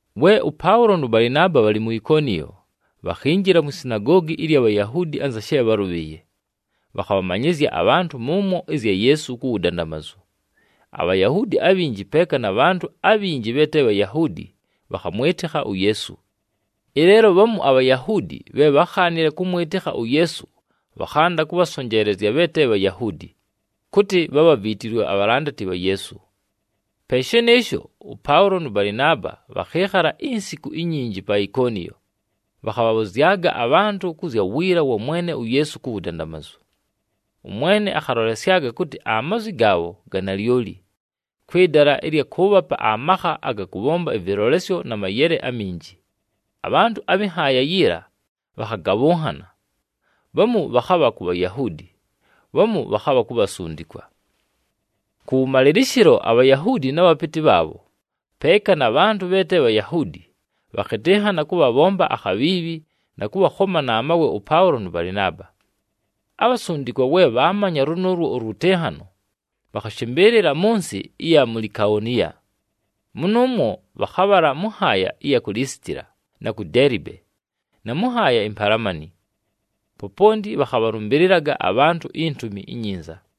We ʉPaʉlo nʉ Balɨnaaba bhalɨ mu Ikoniyo, bhakhinjila mwi sinagoogi ɨlya Bhayahuudi anza she bhálʉbhɨɨye. Bhakhabhamanyɨzya abhantʉ mʉmwo ɨzya Yeesu ku wudandamazu, aBhayahuudi abhinji, peeka na bhantʉ abhinji bhe te Bhayahuudi, bhakhamwɨtɨkha uYeesu. Ɨleelo bhamu aBhayahuudi bhe bhákhaanile kʉmwɨtɨkha uYeesu bhakhanda kʉbhasonjeelezya bhe te Bhayahuudi, kʉtɨ bhabhaviitilwe abhalandati bha Yeesu. Pe shɨnɨɨsho, ʉPaʉlo nʉ Balɨnaaba bhakhɨɨkhala insiku inyinji pa Ikoniyo, bhakhabhabhʉzyaga abhantʉ kʉ zya wiila wa Mwene uYeesu ku wudandamazu. ɄMwene akhalolesyaga kʉtɨ amazwi gaabho ga nalyoli, kwɨ dala ɨlya kʉʉbhapa amakha aga kʉbhomba ɨvɨlolesyo na mayele aminji. Abhantʉ abhɨ nhaaya yiila bhakhagabhʉnhana, bhamu bhakhabha ku Bhayahuudi, bhamu bhakhabha ku bhasundikwa. Kʉwʉmalɨlɨshɨlo, aBhayahuudi na bhapɨtɨ bhaabho, peeka na bhantʉ bhe te Bhayahuudi, bhakhɨtɨnhana kʉbhabhomba akhabhiibhi na kʉbhakhoma na mawe ʉPaʉlo nʉ Balɨnaaba. Abhasundikwa we bhaamanya lʉnʉʉlwo ʉlwɨtɨnhano, bhakhashɨmbɨɨlɨla mʉ nsɨ ɨya mu Likaoniya, mʉnʉʉmwo bhakhabhala mʉ nhaaya ɨya ku Lisitila na ku Deelibe, na mʉ nhaaya impalamani. Poponti bhakhabhalʉmbɨlɨlaga abhantʉ iNtumi iNyinza.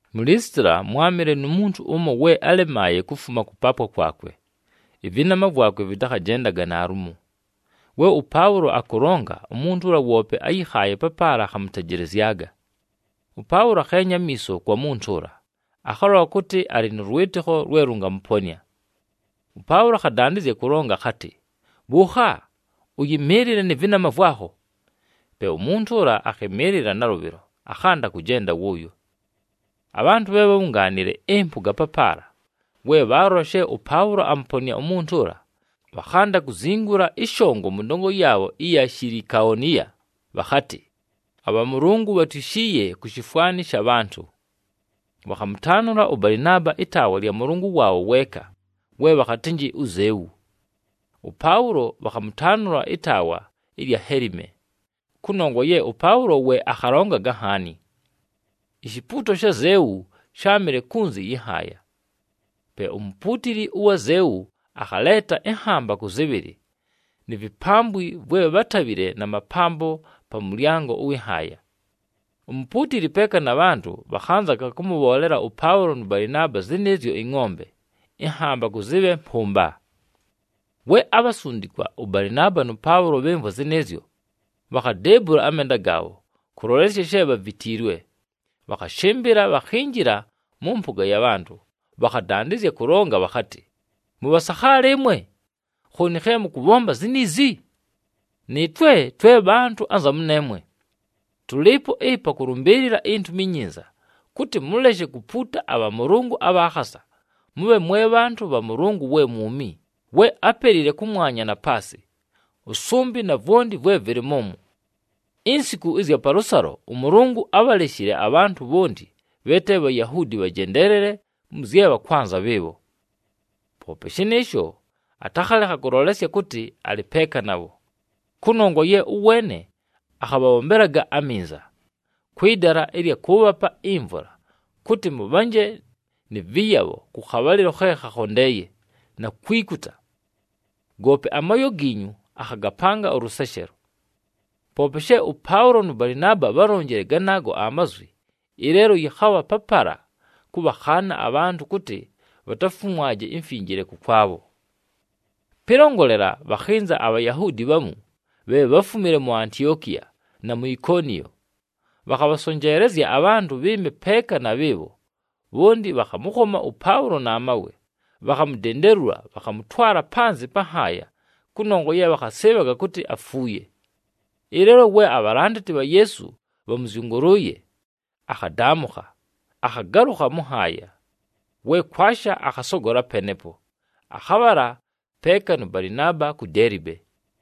Mu Lisitila, mwámɨle nu muntu ʉmo we álemaaye kufuma kʉpaapwa kwakwe, ɨvɨnama vwakwe vɨtakhajendaga naalumo. We ʉPaʉlo akʉlonga, umuntu ʉla woope áyɨkhaaye papaala akhamʉtejelezyaga. ɄPaʉlo akheenya amiiso kwa muntu ʉla, akhalola kʉtɨ alɨ nʉ lwɨtɨkho lwe lʉngamʉponɨa. ɄPaʉlo akhadandɨzya kʉlonga akhatɨ, “Bhʉʉkha! Ʉyɨmɨɨlɨle nɨ vɨnama vwakho!” Pe umuntu ʉla akhɨmɨɨlɨla nalʉbhɨlo, akhanda kʉjenda wʉʉyo. Abhantʉ bhe bhábhungaanile ɨmpʉga papaala, we bhaalola she ʉPaʉlo amʉponɨa umuntu ʉla, bhakhanda kuzingula ɨshongo mʉ ndongo yaabho ɨya Shilikaoniya bhakhatɨ, “Abhamʉlʉngʉ bhatwishiiye ku shifwani sha bhantʉ!” Bhakhamʉtaanʉla ʉBalɨnaaba ɨtaawa lya mʉlʉngʉ waabho weeka, we bhakhatɨ uZeu. ɄPaʉlo, bhakhamʉtaanʉla ɨtaawa ɨlya Helime, kʉnongwa ye ʉPaʉlo we akhalongaga nhaani. Ishipuuto sha Zeu sháamɨle kunzi yɨ nhaaya. Pe umupuutili ʉwa Zeu akhaleeta ɨnhambakʉ zɨbhɨlɨ, ni vipambwi vwe bhátabhile na mapambo pa mʉlyango ʉwɨ nhaaya. Umupuutili peeka na bhantʉ bhakhanzaga kʉmʉbhoolela ʉPaʉlo nʉ Balɨnaaba zɨnɨɨzyo ɨngʼombe ɨnhambakʉ zɨbhe mpʉmba. We abhasundikwa ʉBalɨnaaba nʉ Paʉlo bhɨmvwa zɨnɨɨzyo, bhakhadeebula amenda gaabho kʉlolesya she bhavitiilwe. Bhakhashɨmbɨla, bhakhinjila mʉ mpʉga ya bhantʉ, bhakhadandɨzya kʉlonga bhakhatɨ, “Mʉbhasakhaala ɨmwe! Khooni khe mʉkʉbhomba ziniizi? Nɨɨtwe twe bhantʉ anza mʉneemwe! Tʉlɨɨpo ɨpa kʉlʉmbɨɨlɨla iNtumi iNyinza, kʉtɨ mʉleshe kupuuta abhamʉlʉngʉ abha khasa, mʉbhe mwe bhantʉ bha Mʉlʉngʉ we mwumi, we ápelile kʉmwanya, na paasɨ, ʉsʉmbɨ, na vwonti vwe vɨlɨ mʉmwo. Insiku ɨzya palʉsalo ʉMʉlʉngʉ ábhaleshile abhantʉ bhonti bhe te Bhayahuudi bhajendeelele mʉ zye bhakwanza bhɨɨbho. Poope shɨnɨɨsho, atakhalekha kʉlolesya kʉtɨ alɨ peeka nabho. Kʉnongwa ye ʉweene akhabhabhombelaga aminza, kwɨ dala ɨlya kʉʉbhapa imvula, kʉtɨ mʉbhanje nɨ vɨyabho kʉ khabhalɨlo khe khakhondeeye, na kwikuta. Goope amooyo giinyu, akhagapanga ʉlʉseshelo.” Poope she ʉPaʉlo nʉ Balɨnaaba bhálonjile ganaago amazwi, ɨleelo yɨkhabha papala kʉbhakhaana abhantʉ kʉtɨ bhatafumwaje imfinjile kʉkwabho. Pɨlongolela, bhakhɨnza aBhayahuudi bhamu bhe bháfumile mu Antiokiya, na mu Ikoniyo. Bhakhabhasonjeelezya abhantʉ bhɨɨme peeka na bhɨɨbho, bhonti bhakhamʉkhoma ʉPaʉlo na mawe. Bhakhamudendelula bhakhamʉtwala panzɨ pa nhaaya kʉnongwa ye bhakhasɨɨbhaga kʉtɨ afuuye. Ɨleelo we abhalandati bha Yeesu bhamʉzyʉngʉlʉʉye, akhadaamʉkha, akhagalʉkha mʉ nhaaya. We kwasha, akhasogola penepo, akhabhala peeka nʉ Balɨnaaba ku Deelibe.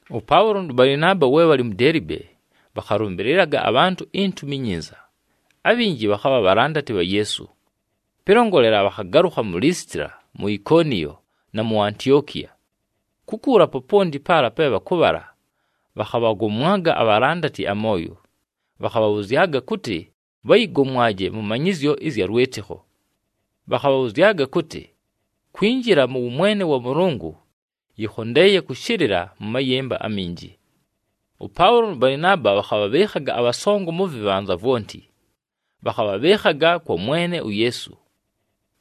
ɄPaʉlo nʉ Balɨnaaba, we bhalɨ mu Deelibe, bhakhalʉmbɨlɨlaga abhantʉ iNtumi iNyinza, abhinji bhakhabha bhalandati bha Yeesu. Pɨlongolela, bhakhagalʉkha mu Lisitila, mu Ikoniyo, na mu Antiokiya. Kukuula poponti paala pe bhakʉbhala bhakhabhagomwaga abhalandati amooyo, bhakhabhabhʉzyaga kʉtɨ bhayɨgomwaje mʉ manyɨzyo ɨzya lwɨtɨkho. Bhakhabhabhʉzyaga kʉtɨ, “Kwinjila mʉ wʉmwene wa Mʉlʉngʉ, yɨkhondeeye kʉshɨlɨla mʉ mayɨmba aminji.” ɄPaʉlo nʉ Balɨnaaba bhakhabhabhɨɨkhaga abhasongo mʉ vɨbhanza vwonti. Bhakhabhabhɨɨkhaga kwa Mwene uYeesu,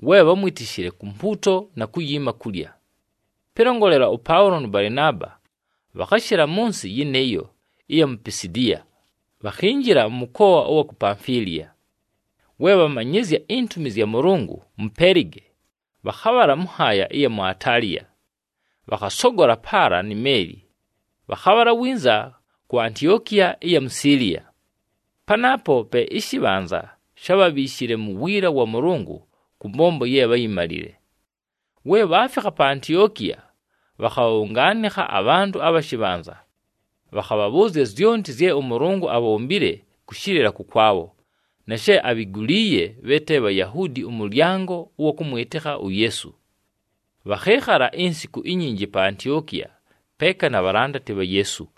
we bhámwitishile, ku mpuuto na kuyiima kulya. Pɨlongolela, ʉPaʉlo nʉ Balɨnaaba bhakhashɨla mʉ nsɨ yɨnɨɨyo ɨya mu Pisidiya, bhakhinjila mʉ mʉkoa ʉwa ku Pamfiliya. We bhamanyɨzya intumi zya Mʉlʉngʉ mu Pelige, bhakhabhala mʉ nhaaya ɨya mu Ataliya. Bhakhasogola paala ni meeli, bhakhabhala winza ku Antiokiya ɨya mu Siiliya, panaapo pe ɨshɨbhanza shábhabhiishile mu wiila wa Mʉlʉngʉ kʉ mbombo ye bháyimalile. We bhaafikha pa Antiokiya, bhakhabhabhʉngaanɨkha abhantʉ abha shɨbhanza. Bhakhabhabhʉʉzya zyonti zye ʉMʉlʉngʉ abhombile kʉshɨlɨla kʉkwabho, na she abhiguliiye bhe te Bhayahuudi ʉmʉlyango ʉwa kʉmwɨtɨkha uYeesu. Bhakhɨɨkhala insiku inyinji pa Antiokiya peeka na bhalandati bha Yeesu.